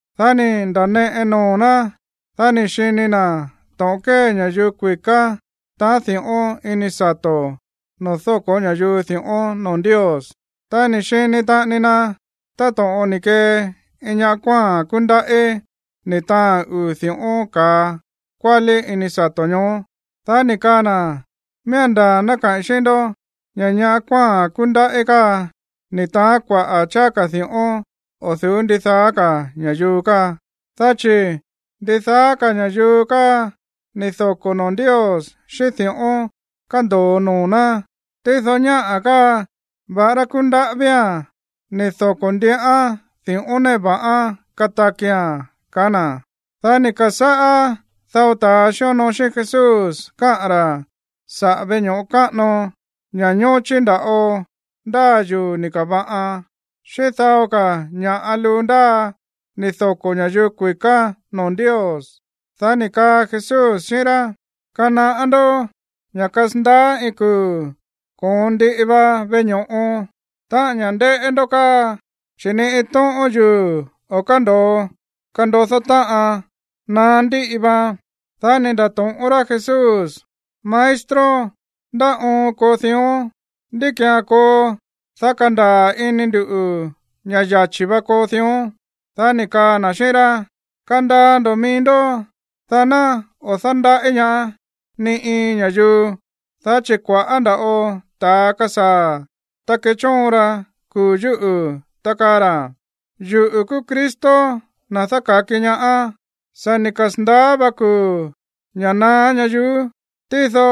Dá ni̱ nda̱neꞌe noo̱ ná, dá ni̱ xini na̱ to̱ꞌon kée ña̱yuu kui̱ká taáa̱n di̱ꞌón ini sato̱ noo̱ dóko̱ ña̱yuu di̱ꞌón noo̱ Ndios. Ta ni̱ xini taꞌani na táto̱ꞌon ni̱ kee iin ñaꞌá kuáa̱n kúndaꞌí, ni̱ taáa̱n uu̱ di̱ꞌón ka̱a kuálí ini sato̱ ñoó. Dá ni̱ kaa na̱: ―Miía̱n ndaa̱ ná kaꞌi̱n xíꞌín ndó ña̱ ñaꞌá kuáa̱n kúndaꞌí káa ni̱ taán kuaꞌa̱ cháá ka̱ di̱ꞌón o̱ du̱ú ndidaá ka̱ ña̱yuu káa. Dá chi̱ ndidaá ka̱ ña̱yuu káa ni̱ doko̱ noo̱ Ndios xíꞌín di̱ꞌón kándo̱o noo̱ ná, tído ñáꞌa̱ káa, va̱ꞌará kúndaꞌí vía̱n, ni̱ doko̱ ndiꞌán di̱ꞌón néꞌe va̱ꞌán katakia̱n ―kaá na̱. Dá ni̱ ka̱sáꞌá dao ta̱a xíonoo xíꞌín Jesús káꞌa̱n ra̱ saꞌa̱ veꞌe ño̱ꞌo káꞌano, ña̱ ñóchí nda̱ꞌo ndáa yuu̱ ni̱ ka̱va̱ꞌan, xíꞌín dao ka̱ ña̱ꞌa luu ndáa ni̱ doko̱ ña̱yuu kui̱ká noo̱ Ndios. Dá ni̱ kaa Jesús xíꞌín rá: ―Kanaꞌá ndó ña̱ kasandaá iin kuu̱ koon ndiꞌi va veꞌe ño̱ꞌo, táꞌa̱n ña̱ ndéꞌé ndó káa, chi̱ ni iin tóꞌón yuu̱ o̱ kándo̱o kandodó táꞌan. Naá ndíꞌi vaan. Dá ni̱ nda̱to̱ꞌón rá Jesús: ―Maestro, ¿ndá oon koo dión? ¿Ndí ki̱án koo, dá kandaa̱ ini nduꞌu̱ ña̱ yachi̱ va koo dión? Dá ni̱ kaa na̱ xíꞌín rá: ―Kandaa ndo̱ mií ndó, dá ná o̱ dándaꞌí ñaá ni iin ña̱yuu, dá chi̱ kua̱ꞌá nda̱ꞌo ta̱a kasaa̱, ta kechóon ra kuu̱ yúꞌu̱, ta kaa ra̱: “Yuꞌu̱ kúú Cristo, na̱ dáka̱ki ñaá. Sa̱ ni̱ kasa̱ndaá va kuu̱ ña̱ naá ñayuú.” Tído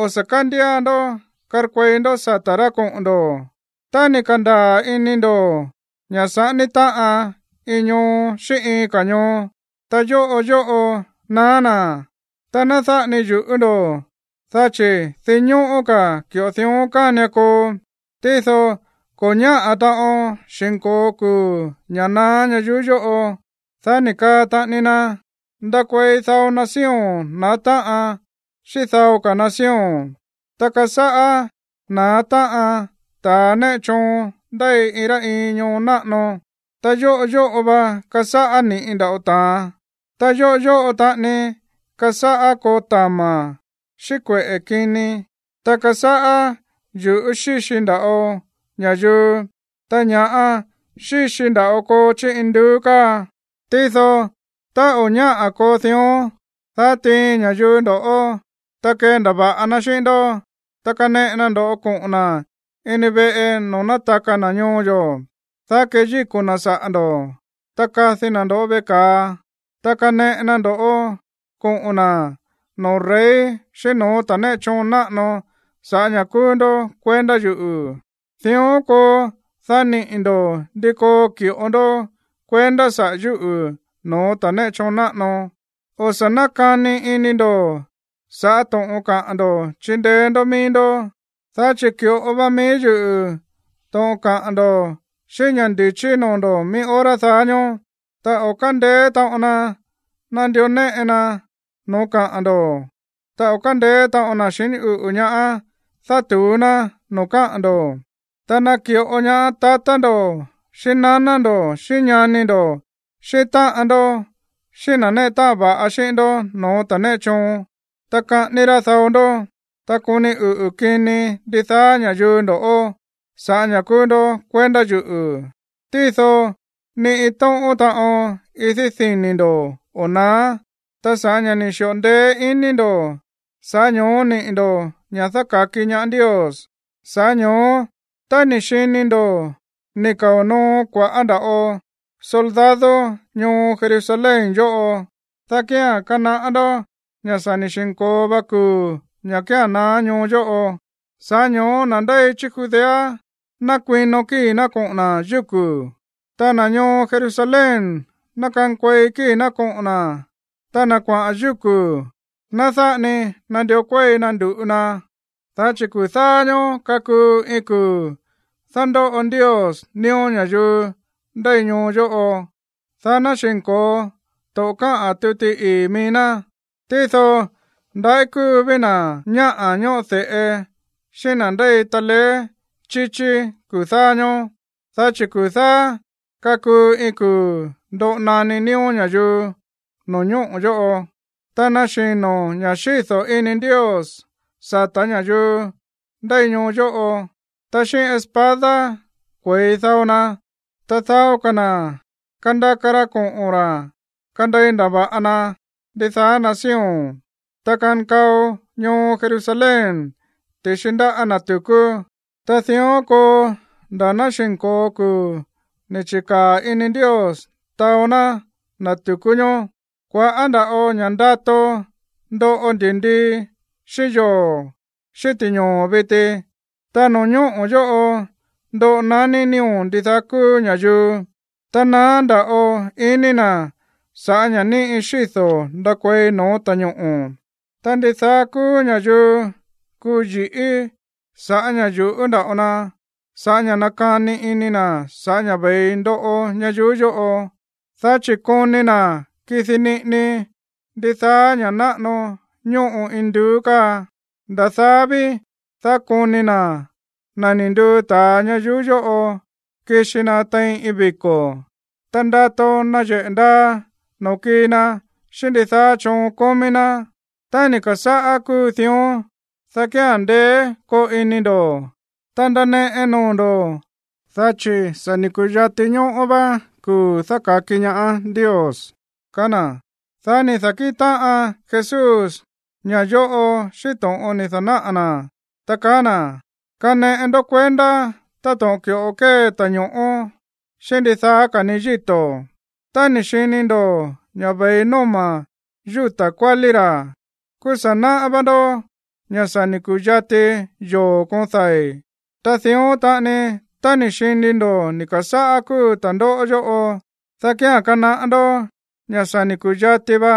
o̱ sa̱ kándía ndó karkuei ndó sata̱ rá koꞌo̱n ndo̱. Tá ni̱ ka̱ndaa̱ ini ndo̱ ña̱ saꞌání táꞌan iin ñoo xíꞌín iin ka̱ ñoo, ta yóꞌo yóꞌo naá na̱, ta ná dáꞌa ni yu̱ꞌú ndo̱, dá chi̱ dinñóꞌó ka̱ ki̱ꞌo dión kánian koo, tído ko̱ ñáꞌa̱ taꞌon xi̱nko̱o kuu̱ ña̱ naá ñayuú yóꞌo. Dá ni̱ kaa taꞌani na: ―Ndakuei dao nación na̱á táꞌan xíꞌín dao ka̱ nación, ta kasáꞌá na̱á táꞌan ta̱ néꞌe choon ndéi iin rá iin ñoo náꞌano. Ta yóꞌo yóꞌo va kasáꞌá ni̱ꞌi nda̱ꞌo ta̱an, ta yóꞌo yóꞌo taꞌani kasáꞌá koo tama̱ xíꞌín kueꞌe̱ kini, ta kasáꞌá yu̱ꞌú xíxi nda̱ꞌo ña̱yuu, ta ña̱ꞌa xíxi nda̱ꞌo koo chí induú káa. ’Tído tá o̱ ñáꞌa̱ koo dión, dá tiin ña̱yuu ndo̱ꞌó, ta kendava̱ꞌa na xíꞌín ndó. Ta kaneꞌe na ndo̱ꞌó koꞌo̱n na̱ ini veꞌe noo̱ nátaka na̱ ñoo yo̱, dá keyíko̱ na̱ saꞌa̱ ndo̱. Ta kadi na̱ ndo̱ꞌó veꞌe ka̱a. Ta kaneꞌe na ndo̱ꞌó koꞌo̱n na̱ noo̱ rey xíꞌín no̱ó ta̱ néꞌe choon náꞌano sa̱ꞌá ña̱ kúú ndó kuendá yuꞌu̱. Dión koo, dá niꞌi̱ ndo̱ ndi koo ki̱ꞌo ndó kuendá saꞌa̱ yúꞌu̱ no̱ó ta̱ néꞌe choon náꞌano. O̱ sa̱ nákani ini ndo̱ sa̱ꞌá to̱ꞌon kaꞌa̱n ndo̱ chindeé ndó mií ndó, dá chi̱ ki̱ꞌo va mií yuꞌu̱ to̱ꞌon kaꞌa̱n ndo̱ xíꞌín ña̱ ndi̱chí noo̱ ndo̱ mií hora daá ñóó. Ta o̱ kándeé taꞌon na nandió néꞌe na no̱ó kaꞌa̱n ndo̱, ta o̱ kándeé taꞌon na̱ xiní uꞌu̱ ñaá dátu̱ú ná no̱ó kaꞌa̱n ndo̱. Ta naki̱ꞌo ñaá tatá ndo̱ xíꞌín naná ndo̱ xíꞌín ñani ndo̱, xíꞌín táꞌan ndó xíꞌín na̱ néꞌe táꞌan va̱ꞌa xíꞌín ndó no̱ó ta̱ néꞌe choon; ta kaꞌání rá dao ndó. Ta koni uꞌu̱ kini ndidaá ña̱yuu ndo̱ꞌó sa̱ꞌá ña̱ kúú ndó kuendá yuꞌu̱. Tído ni iin tóꞌón taꞌon idí dini̱ ndo̱ o̱ naá. Ta sa̱ꞌá ña̱ ni̱ xi̱ꞌo ndeé ini ndo̱, sa̱ꞌá ño̱ó niꞌi̱ ndo̱ ña̱ dáka̱ki ñaá Ndios. ’Sa̱ꞌá ño̱ó tá ni̱ xini ndo̱ ni̱ kao̱ noo kua̱ꞌá ndava̱ꞌo soldado ñoo Jerusalén yóꞌo, dá kía̱n kanaꞌá ndó ña̱ sa̱ ni̱ xi̱nko̱o va kuu̱ ña̱ kía̱n naá ñoo yóꞌo. Sa̱ꞌá ño̱ó na̱ ndéi chí Judea ná kuino kíi̱ ná koꞌo̱n na̱ yúku̱, ta na̱ ñoo Jerusalén ná kankuei kíi̱ ná koꞌo̱n na̱, ta na̱ kuaꞌa̱n yúku̱, ná dáꞌa ni nandió kuéi na ndu̱ꞌu na. Dá chi̱ kuu̱ dáá ñóó kakuu iin kuu̱ dándóꞌo Ndios nío̱ ña̱yuu ndéi ñoo yóꞌo, dá ná xi̱nko̱o to̱ꞌon káꞌa̱n tuti ii̱ mií ná. Tído ndaꞌí kúu ví na̱ ñáꞌa̱ ñóꞌo de̱ꞌe xíꞌín na̱ ndéi taleé chíchí kuu̱ dáá ñóó, dá chi̱ kuu̱ dáá kakuu iin kuu̱ ndoꞌo naní nío̱ ña̱yuu no̱ñóꞌo̱ yóꞌo, ta naxi̱no ña̱ xído̱ ini Ndios sa̱tá ña̱yuu ndéi ñoo yóꞌo. Ta xíꞌín espada kue̱i dao na, ta dao ka̱ na̱ kandaka ra koꞌo̱n ra̱ kandei ndava̱ꞌa na ndidaá nación. Ta kankao ñoo Jerusalén ti̱xi ndáꞌa̱ ta̱ tu̱kú. Ta dión koo nda̱ ná xi̱nko̱o kuu̱ ni̱ chi̱kaa̱ ini Ndios taó ná ta̱ tu̱kú ñoó. ’Kua̱ꞌá nda̱ꞌo ña̱ ndato ndoꞌo ndi̱ndii, xíꞌín yoo̱, xíꞌín ti̱ñoo̱ viti, ta no̱ñóꞌo̱ yóꞌo ndoꞌo naní nío̱ ndidaá kúú ña̱yuu, ta naá nda̱ꞌo ini na̱ sa̱ꞌá ña̱ ni̱ꞌi xído̱ ndakuei no̱ó ta̱ñoꞌo̱. Ta ndidaá kúú ña̱yuu kuu yi̱ꞌí sa̱ꞌá ña̱ yuꞌú nda̱ꞌo na sa̱ꞌá ña̱ nakani ini na̱ sa̱ꞌá ña̱ ve̱i ndoꞌo ñayuú yóꞌo, dá chi̱ koni na̱ kidi niꞌini ndidaá ña̱ náꞌano ñóꞌo induú káa. Nda̱ daá ví, dá koni na̱ na̱ ni̱ nduu ta̱a ñayuú yóꞌo kixi na tein iin viko̱, ta ndato nayeꞌe̱ ndaa noo̱ kii na xíꞌín ndidaá choon kómí ná. Tá ni̱ ka̱sáꞌá kúu dión, dá kía̱n ndeé koo ini ndo̱, ta ndaneꞌe noo̱ ndo̱, dá chi̱ sa̱ ni̱ ku̱yati ñóꞌó vá kuu̱ dáka̱ki ñaá Ndios ―kaá na̱. Dá ni̱ da̱kíꞌin táꞌan Jesús ña̱ yóꞌo xíꞌín to̱ꞌon ni̱ da̱náꞌa̱ na̱, ta kaá na̱: ―Kaneꞌe ndó kuendá táto̱ꞌon ki̱ꞌo kée ta̱ño̱ꞌó xíꞌín ndidaá ka̱ ni yíto̱. Tá ni̱ xini ndo̱ ña̱ ve̱i nóma̱ yúta̱ kuálí ra̱, kúú sa̱ náꞌá vá ndó ña̱ sa̱ ni̱ ku̱yati yoo̱ koon dai̱. Ta dión taꞌani, tá ni̱ xini ndo̱ ni̱ ka̱sáꞌá kúu ta̱ndóꞌó yóꞌo, dá kía̱n kanaꞌá ndó ña̱ sa̱ ni̱ ku̱yati va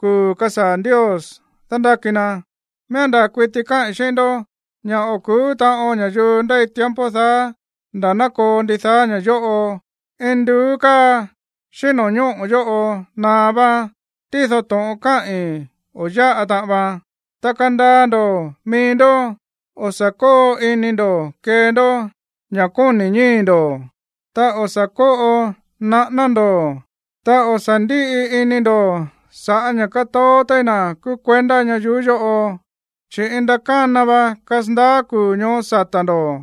kuu̱ kasaa̱ Ndios dándáki na. ’Miía̱n ndaa̱ kuiti káꞌi̱n xíꞌín ndó ña̱ o̱ ku̱ú taꞌon ña̱yuu ndéi tiempo daá nda̱ ná koo ndidaá ña̱ yóꞌo. Induú káa xíꞌín no̱ñóꞌo̱ yóꞌo naá váán, tído to̱ꞌon káꞌi̱n o̱ yáꞌa taꞌan vaan. ’Ta kandaa ndo̱ mií ndó. O̱ sa̱ kóo ini ndo̱ kee ndó ña̱ kóni̱ ñíi̱ ndo̱, ta o̱ sa̱ kóꞌo naꞌáná ndo̱, ta o̱ sa̱ ndíꞌi ini ndo̱ sa̱ꞌá ña̱ kátoó téí na̱ kúú kuendá ñayuú yóꞌo, chi̱ iin ndakána va kasandaá kuu̱ ñoó sata̱ ndo̱.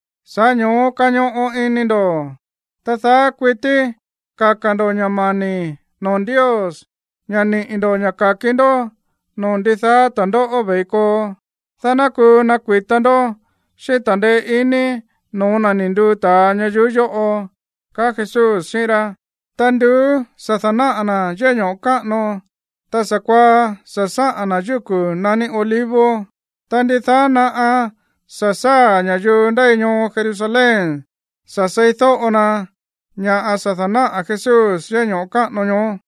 Sa̱ꞌá ño̱ó kañoꞌo ini ndo̱, ta daá kuití kaka̱ ndo̱ ña̱ mani̱ noo̱ Ndios ña̱ niꞌi̱ ndo̱ ña̱ ka̱ki ndó no̱ó ndidaá ta̱ndóꞌó ve̱i koo, dá ná kuu nakui̱ta ndó xíꞌín ta̱ndeé iní no̱ó na̱ ni̱ nduu ta̱a ñayuú yóꞌo ―kaá Jesús xíꞌín rá. Ta nduú sa̱ da̱náꞌa̱ na̱ yéꞌé ño̱ꞌo káꞌano, ta sa̱kuaá sa̱ sáꞌa̱n na̱ yúku̱ naní Olivos. Ta ndidaá naꞌa sa̱ sáa̱ ña̱yuu ndéi ñoo Jerusalén sa̱ seídóꞌo na ña̱ꞌa sa̱ dánaꞌa̱ Jesús yéꞌé ño̱ꞌo káꞌano ñoó.